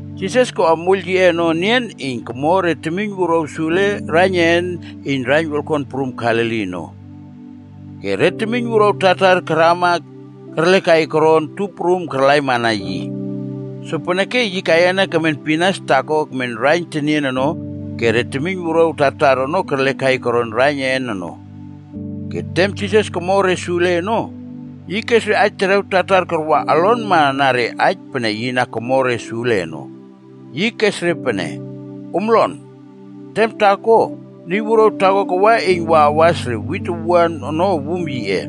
Jisas koꞌa moiyl yiꞌe ono enian iyn komo re temiyn wuruaw sule koron raiyn een iyn raiyn wolkon prum Galili ono. Ke re temiyn wuruaw tartar karama ke kerlekai koron tup prum karlaimana yi. Sopeneke yi kaiyana kemen pinas taakoa kemen raiyn tenien ono ke re temiyn wuruaw tartar ono kerlekai koron raiyn een ono. Ke tem Jisas komo re sule ono, yi kes aij terew tartar karwa olonma na re aij pene yi na komo re sule ono. Yi kes re pene, “Om lon! Tem taako, niy wuruaw taako kawa iyn wa awas re wit owuan ono wum yiꞌe.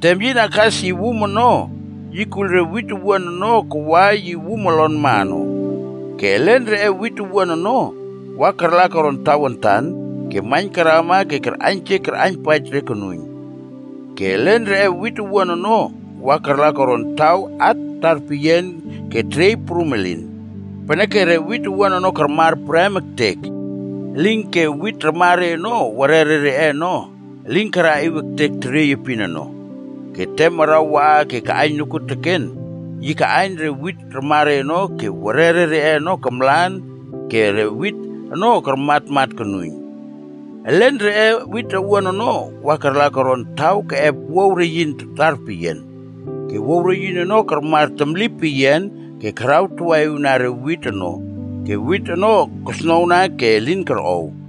Tem yi na kas yi wum ono, yi kuiyl re wit owuan ono kawa yi wum olonma ono. Ke elen reꞌe wit owuan ono, wa karla koron tawantan ke maiyn karama ke karꞌaiynjek karꞌaiynpaij re konuiyn. Ke elen reꞌe wit owuan ono wa karla koron taw at tarpeyian ke teriey prum elin. Peneke re wit owuan ono karmar prem ektek. Elinke wit ramare ono werere reꞌe ono elin karaꞌiw ektek teriey epin ono. Ke tem araw waꞌa ke kaꞌaiyn nokuoteken, yi kaꞌaiyn re wit raman ono ke werere reꞌe ono kamlan ke re wit ono karmatmat konuiyn. Elen reꞌe wit owuan ono wa karla koron taw keꞌep wuaw reyin tarpeyian. Ke wuaw reyin ono karmar temli peyian ke karawtawaꞌiwna re wit ono ke wit ono kosnowna ke elin korꞌow.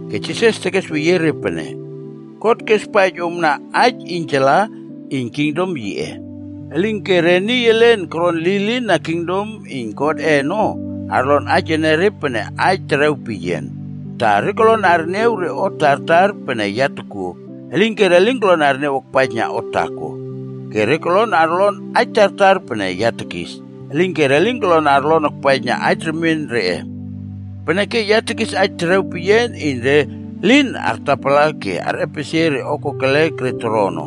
Ke Jisas tekesweyie re pene, “God kespaij omna aij iynjala iyn kingdom yiꞌe. Elinke re niy elen koron lilin na kingdom iyn Godꞌe ono, arlon aij enere pene re aij terew peyian, ta ‘Re kolon arniaw re o tartar pene ya tokuo, elinke re lin kolon arniaw akpaijna o taako. Ke re kolon arlon re aij tartar pene ya tekis, elinke re lin kolon arlon akpaijna aij remien reꞌe. Peneke ya tekis aij terew peyian iyn re lin artapala ke arꞌepesie re o kokelek re toro ono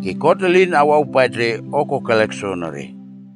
ke God elin awawpaij re o kokelek soonore.’”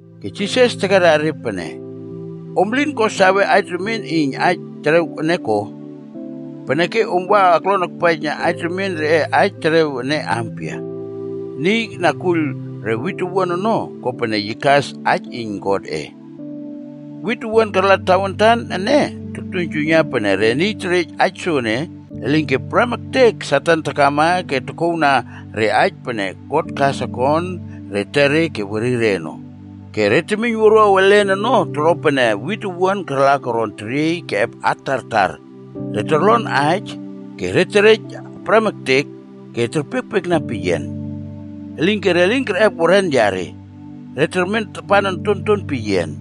Ke Jisas tekera re pene, “Om elin ko sawe aij remien iyn aij terew ene ko? Peneke om wa aklon akpaijna aij remien reꞌe aij terew ampia ya? Niy na kuiyl re wit owuan ono, kopene yi kas aij iyn Godꞌe. Wit owuan karla tawantan ene, toktuiynjuiyna pene re niy terej aij soene, elinke prem ektek Satan takama ke tokouwna re aij pene God kas akon re etere ke werire ono. Ke re temiyn wuruaw elen ono toro pene wit owuan karla koron teriey keꞌep at tartar. Re torlon aij, ke re terej prem ektek, ke re terpiekpiekna peyian. Elinke re lin kerꞌep weren yare. Re termen tapan ontonton peyian.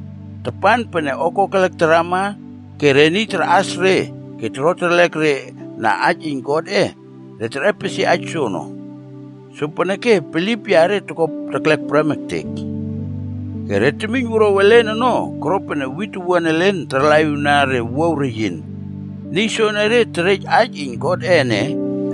Tapan pene o kokelek tarama ke re niy tarꞌas re ke toro terlek re na aij iyn Godꞌe, re terꞌepsie aij soono. Sopeneke bilip yare toko teklek prem ektek.” “Ke re temiyn wuruaw elen ono koro pene wit owuan elen tarlaꞌiwna re wuaw reyin. Niy soenere terej aij iyn Godꞌe ene,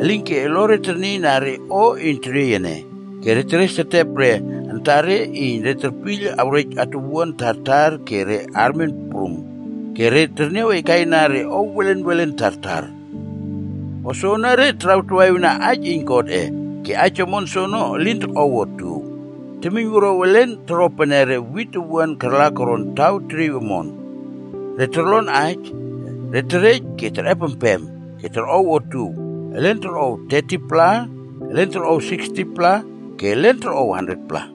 elinke olore ternieiyna re o iyn teriey ene, ke re teresetep re antare iyn re terpiyl awrej atuwuan tartar ke re armen prum, ke re terniawkaina re o welen welen tartar. O soenere tarawtawaꞌiwna aij iyn Godꞌe, ke aij omon soono elin tokꞌow otuow. Temiyn wuruaw elen toro pene re wit owuan karla koron taw teriey omon. Re torlon aij, ke re terej ke terꞌepempem, ke re torꞌow otuow. Elen torꞌow 30-pla, elen torꞌow 60-pla, ke elen torꞌow 100-pla.”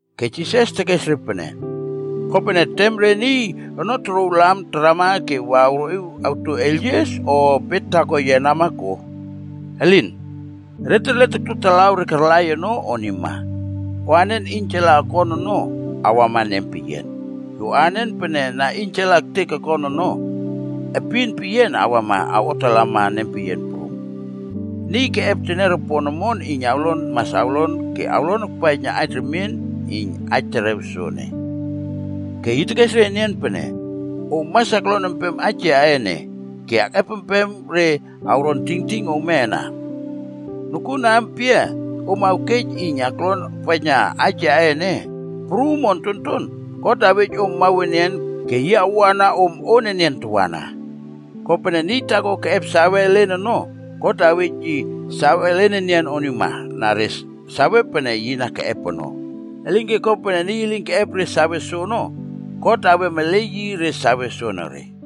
Ke Jisas tekes re pene, “Kopene tem re niy ono torouw lam tarama ke wa awroꞌiw awto eiylyies o bet taako yenama ko? Elin. Re terle tokto talaw re karlai re ono onima. O anen iynjala okon ono, awama nempeyian. Ke o anen pene na iynjala ektek ke okon ono, epin peyian awama awꞌotalama nempeyian prum. Niy keꞌep teniaropon omon iyn awlon mas awlon ke awlon akpaijna aij remien iyn aij terew soene.” Ke yi tekes re enian pene, “Om mas aklon empem aij yaꞌe ene ke akꞌepempem re awron tingting ome ana. Nokuon aampia om awkej iyn aklon akpaijna aij yaꞌe ene, prum o ontonton, God awej om mawenian ke yi awoꞌana om on enian tawana. Kopene, pene niy taako keꞌep sawe elen ono, God awej yi save elen enian onima na re sawe pene yi na keꞌep ono. Elinke kopene niy elin keꞌep re sawe soono, God awem ele yi re sawe soonore.”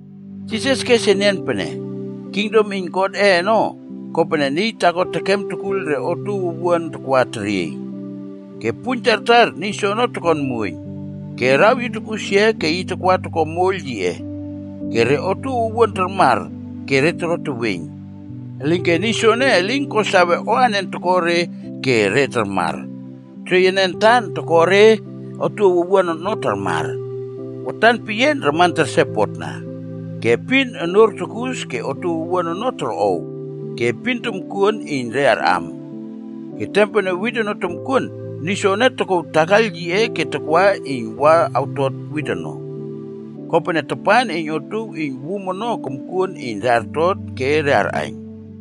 Jisas kes enian pene, “Kingdom iyn Godꞌe ono kopene niy taako tekem tekuiyl re otuow owuan takwa teriey. Ke puiyn tartar niy soene tokon muoiyn, ke araw yi tokꞌusia ke yi takwa toko moiyl yiꞌe. Ke re otuow owuan tarmar ke re toro teweiyn. Elinke niy soene elin ko sawe o anen toko re ke re tarmar. Teriey ene antan toko re otuow owuan ono tarmar. Watan peyian raman tersepotna. Ke epin onuor tukus ke otuow owuan ono torꞌow, ke epin tomkuon iyn re arꞌam. Ke tem pene wit ono tomkuon, niy soene tokouw takaiyl yiꞌe ke takwa iyn wa awtot re wit ono. Kopene tapan iyn otuow iyn wum ono komkuon iyn re artot ke re arꞌaiyn.”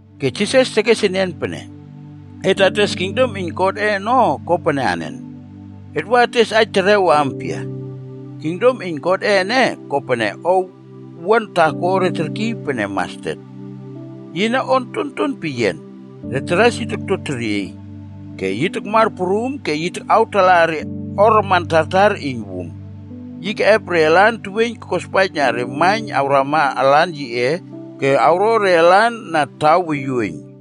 Ke Jisas tekes enian pene, “Et ates kingdom iyn Godꞌe ono kopene anen? Et wa ates aij terew ampia? Kingdom iyn Godꞌe ene kopene o owuan taako re terkiy pene ‘mastet.’ Yine o ontonton peyian. Re taras yi tokto teriey, ke yi takmar prum ke yi takꞌawtalaꞌa re o raman tartar iyn wum. Yi keꞌep re alan teweiyn kospaijna re maiyn awramana alan yiꞌe ke awro re lan na taw woyuoiyn.”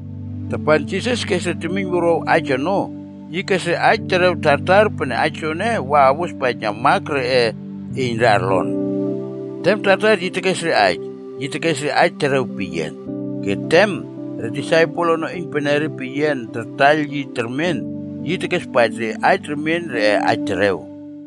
Tapan Jisas kes re temiyn wuruaw aij ono, yi kes re aij terew tartar pene aij soene wa awospaijna mak reꞌe iyn re arlon. Tem tartar yi tekes re aij, yi tekes re aij terew peyian. Ke tem re disaipel ono iynpenere peyian tartaiyl yi termen ke yi tekespaij re aij remien reꞌe aij terew.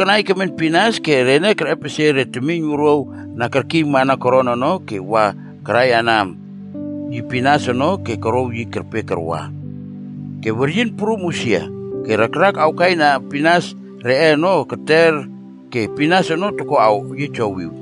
Jisas ono kanai kemen pinas ke rene kerꞌepesie re temiyn wuruaw na kerkiymana koron ono ke wa karaiyana yi pinas ono ke korouw yi kerpe karwa. Ke weryin prum usia, ke rakrak awkaina pinas reꞌe ono keter ke pinas ono toko awyiejowiw.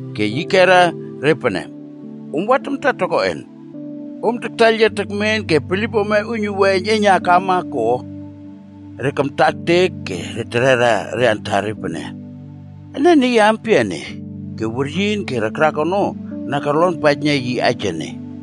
Ke yi kera re pene, “Om wa tamta tokoꞌen? Om taktaiyl yia tekmen ke bilip ome uiynuwua eiyneiynna akama ko?” Re kamta ektek ke re terera re antare pene, “Ene niy ampia ene, ke weryin ke rakrak ono na korlonpaijna yi aij ene?”